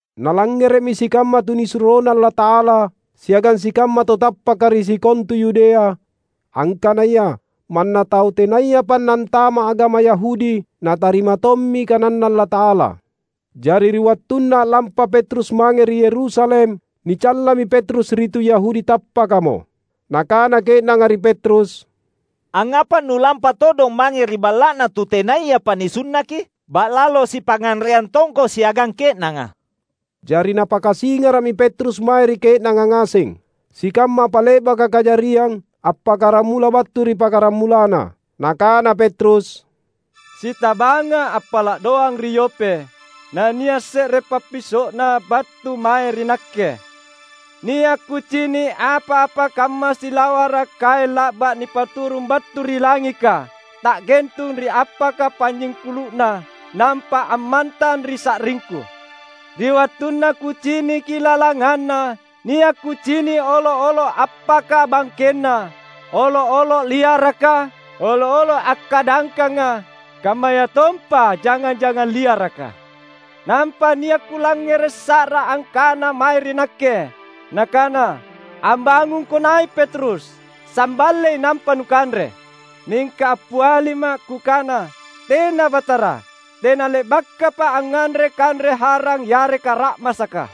Nalangngere’mi sikamma tunisuroNa Allata’ala siagang sikamma tau tappaka ri sikontu Yudea, angkanaya manna tau tenayapa nantama’ agama Yahudi natarima tommi kananNa Allata’ala. Jari ri wattunna a’lampa Petrus mange ri Yerusalem, nicallami Petrus ri tu Yahudi tappakamo. Nakana ke’nanga ri Petrus, "Angngapa nu’lampa todong mange ri balla’na tu tenayapa nisunnaki? Ba’lalo sipangnganreang tongko siagang ke’nanga!" Jari napakasingara’mi Petrus mae ri ke’nanga ngaseng, sikamma apa le’baka kajariang, appakkaramula battu ri pakkaramulanna. Nakana Petrus, "Sitabanga’ appala’ doang ri Yope, nania’ se’re pappiso’na battu mae ri nakke. Nia’ kucini’ apa-apa kamma silawara’ kaeng la’ba’ nipaturung battu ri langika, ta’gentung ri appaka panynyingkulu’na, nampa ammantang ri sa’ringku. Ri wattunna kuciniki lalanganna, nia’ kucini’ olo’-olo’ appaka bangkenna, olo’-olo’ liaraka, olo’-olo’ akkadangkanga, kammayatompa jangang-jangang liaraka. Nampa nia’ kulangngere’ sa’ra angkana mae ri nakke, nakana, ‘Ambangungko nai’ Petrus! Samballei nampa nukanre!’ Mingka appialima’ kukana, ‘Tena, Batara! Tena’ le’bakapa’ angnganre kanre harang yareka ra’masaka.’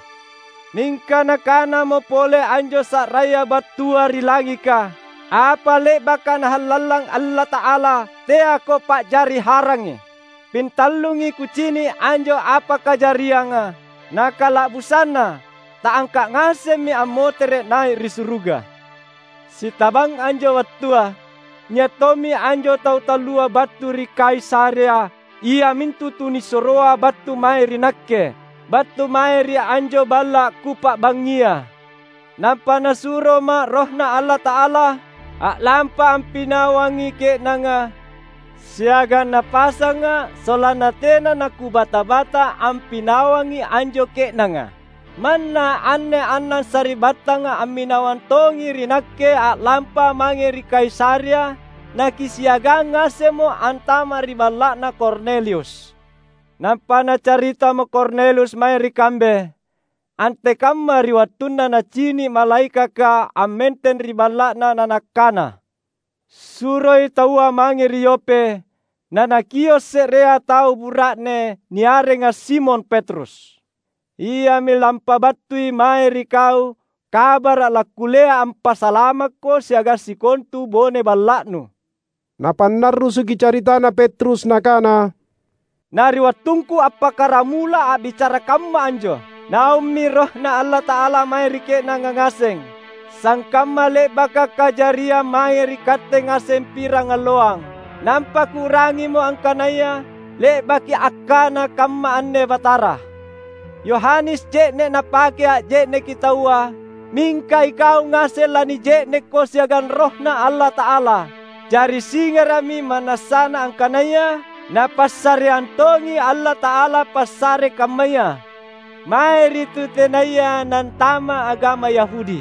Mingka nakanamo pole anjo sa’raya battua ri langika, ‘Apa le’baka Nahallallang Allata’ala, teako pa’jari harangi.’ Pintallungi kucini’ anjo apa kajarianga. Nakala’busanna ta’angka’ ngasemmi ammotere’ nai’ ri suruga. Sitabang anjo wattua, nia’ tommi anjo tau tallua battu ri Kaisarea iamintu tunisuroa battu mae ri nakke, battu mae ri anjo balla’ kupa’bangngia. Nampa Nasuroma’ RohNa Allata’ala a’lampa ampinawangi ke’nanga, siagang Napasanga’ sollanna tena nakubata-bata ampinawangi anjo ke’nanga. Manna anne annang sari’battanga amminawang tongi ri nakke a’lampa mange ri Kaisarea, nakisiagang ngasemmo antama’ ri balla’na Kornelius. Nampa nacaritamo Kornelius mae ri kambe antekamma ri wattunna nacini’ malaekaka ammenteng ri balla’na na nakana, ‘Suroi taua mange ri Yope nanakio’ se’rea tau bura’ne niarenga Simon Petrus. Iami lampabattui mae ri kau kabara’ lakkullea ampasalamakko siagang sikontu bone balla’nu.’" Napannarrusuki caritana Petrus nakana, "Na ri wattungku appakkaramula a’bicara kamma anjo, Naummi RohNa Allata’ala mae ri ke’nanga ngaseng, sangkamma le’baka kajariang mae ri katte ngaseng pirangalloang. Nampa kuu’rangimo angkanaya le’baki akkana kamma anne Batara, ‘Yohanes je’ne’ napake anje’neki taua, mingka ikau ngaseng lanije’nekko siagang RohNa Allata’ala.’ Jari singara’mi ma’nassana angkanaya Napassareang tongi Allata’ala passare kammaya mae ri tu tenaya nantama’ agama Yahudi,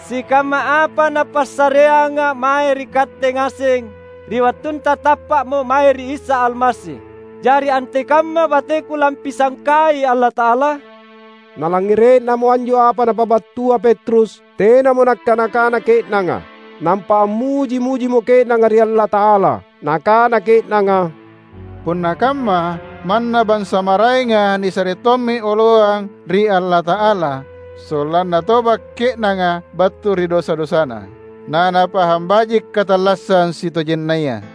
sikamma apa Napassareanga mae ri katte ngaseng ri wattunta tappa’mo mae ri Isa Almasi. Jari antekamma bateku lampisangkai Allata’ala?" Nalangngere’namo anjo apa napabattua Petrus, tenamo nakkana-kana ke’nanga. Nampa ammuji-mujimo ke’nanga ri Allata’ala. Nakana ke’nanga, "Punna kamma, manna bansa maraenga nisare tommi oloang ri Allata’ala sollanna toba’ ke’nanga battu ri dosa-dosana, nanapahang baji’ katallassang sitojennaya!"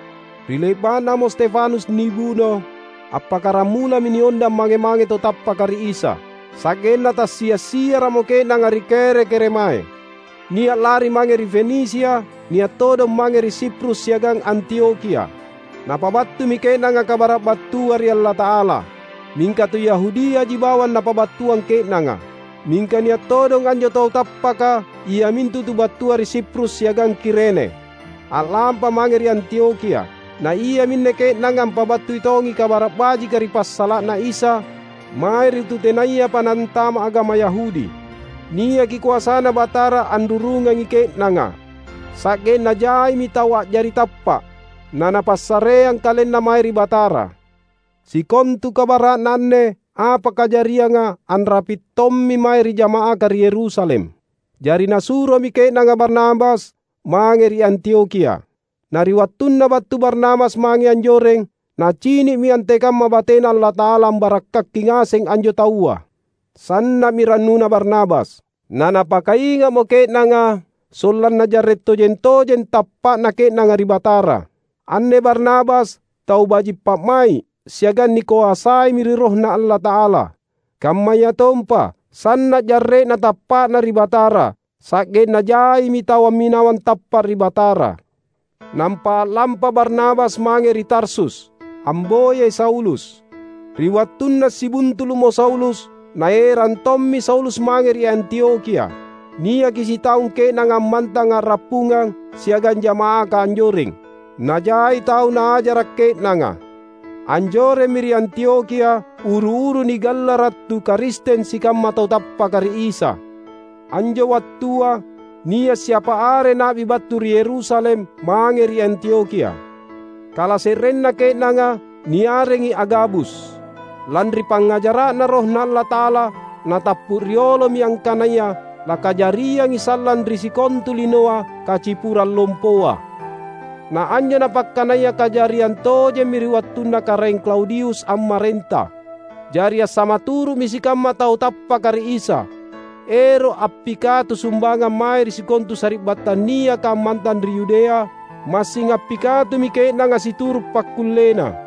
Ri le’ba’namo Stefanus nibuno, appakkaramulami niondang mange-mange tau tappaka ri Isa, sa’genna tassia’-siara’mo ke’nanga ri kere-keremae. Nia’ lari mange ri Fenisia, nia’ todong mange ri Siprus siagang Antiokhia. Napabattumi ke’nanga kabara’ battua ri Allata’ala. Mingka tu Yahudiaji bawang napabattuang ke’nanga. Mingka nia’ todong anjo tau tappaka, iamintu tu battua ri Siprus siagang Kirene, a’lampa mange ri Antiokhia. Na iaminne ke’nanga ampabattui tongi Kabara’ Bajika ri passala’na Isa mae ri tu tenayapa nantama’ agama Yahudi. Niaki koasaNa Batara anrurungangi ke’nanga, sa’genna jaimi tau a’jari tappa’, nanapassareang kalenna mae ri Batara. Sikontu kabara’na anne apa kajarianga anrapi’ tommi mae ri jama’aka ri Yerusalem. Jari nasuromi ke’nanga Barnabas mange ri Antiokhia. Na ri wattunna battu Barnabas mange anjoreng, nacini’mi antekamma bateNa Allata’ala ambarakkaki ngasengi anjo taua. Sanna’mi rannuna Barnabas. Na napakainga’mo ke’nanga sollanna jarre’ tojeng-tojeng tappa’na ke’nanga ri Batara. Anne Barnabas tau baji’ pa’mai’ siagang nikoasaimi ri RohNa Allata’ala; kammayatompa sanna’ jarre’na tappa’na ri Batara, sa’genna jaimi tau amminawang tappa’ ri Batara. Nampa a’lampa Barnabas mange ri Tarsus, amboyai Saulus. Ri wattunna sibuntulu’mo Saulus, naerang tommi Saulus mange ri Antiokhia. Niaki sitaung ke’nanga ammantang a’rappungang siagang jama’aka anjoreng, najai tau naajara’ ke’nanga. Anjoremmi ri Antiokhia uru-uru nigallara’ tu Karisteng sikamma tau tappaka ri Isa. Anjo wattua nia’ siapa are na’bi battu ri Yerusalem mange ri Antiokhia. Kalase’renna ke’nanga niarengi Agabus. Lanri pangngajara’Na RohNa Allata’ala, natappu riolomi angkanaya lakajariangi sallang ri sikontu linoa kacipurang lompoa. (Na anjo napakkanaya kajariang tojemmi ri wattunna Karaeng Klaudius ammarenta.) Jari assamaturu’mi sikamma tau tappaka ri Isa, ero’ appikatu sumbangang mae ri sikontu sari’battang niaka ammantang ri Yudea; massing appikatumi ke’nanga situru’ pakkullena.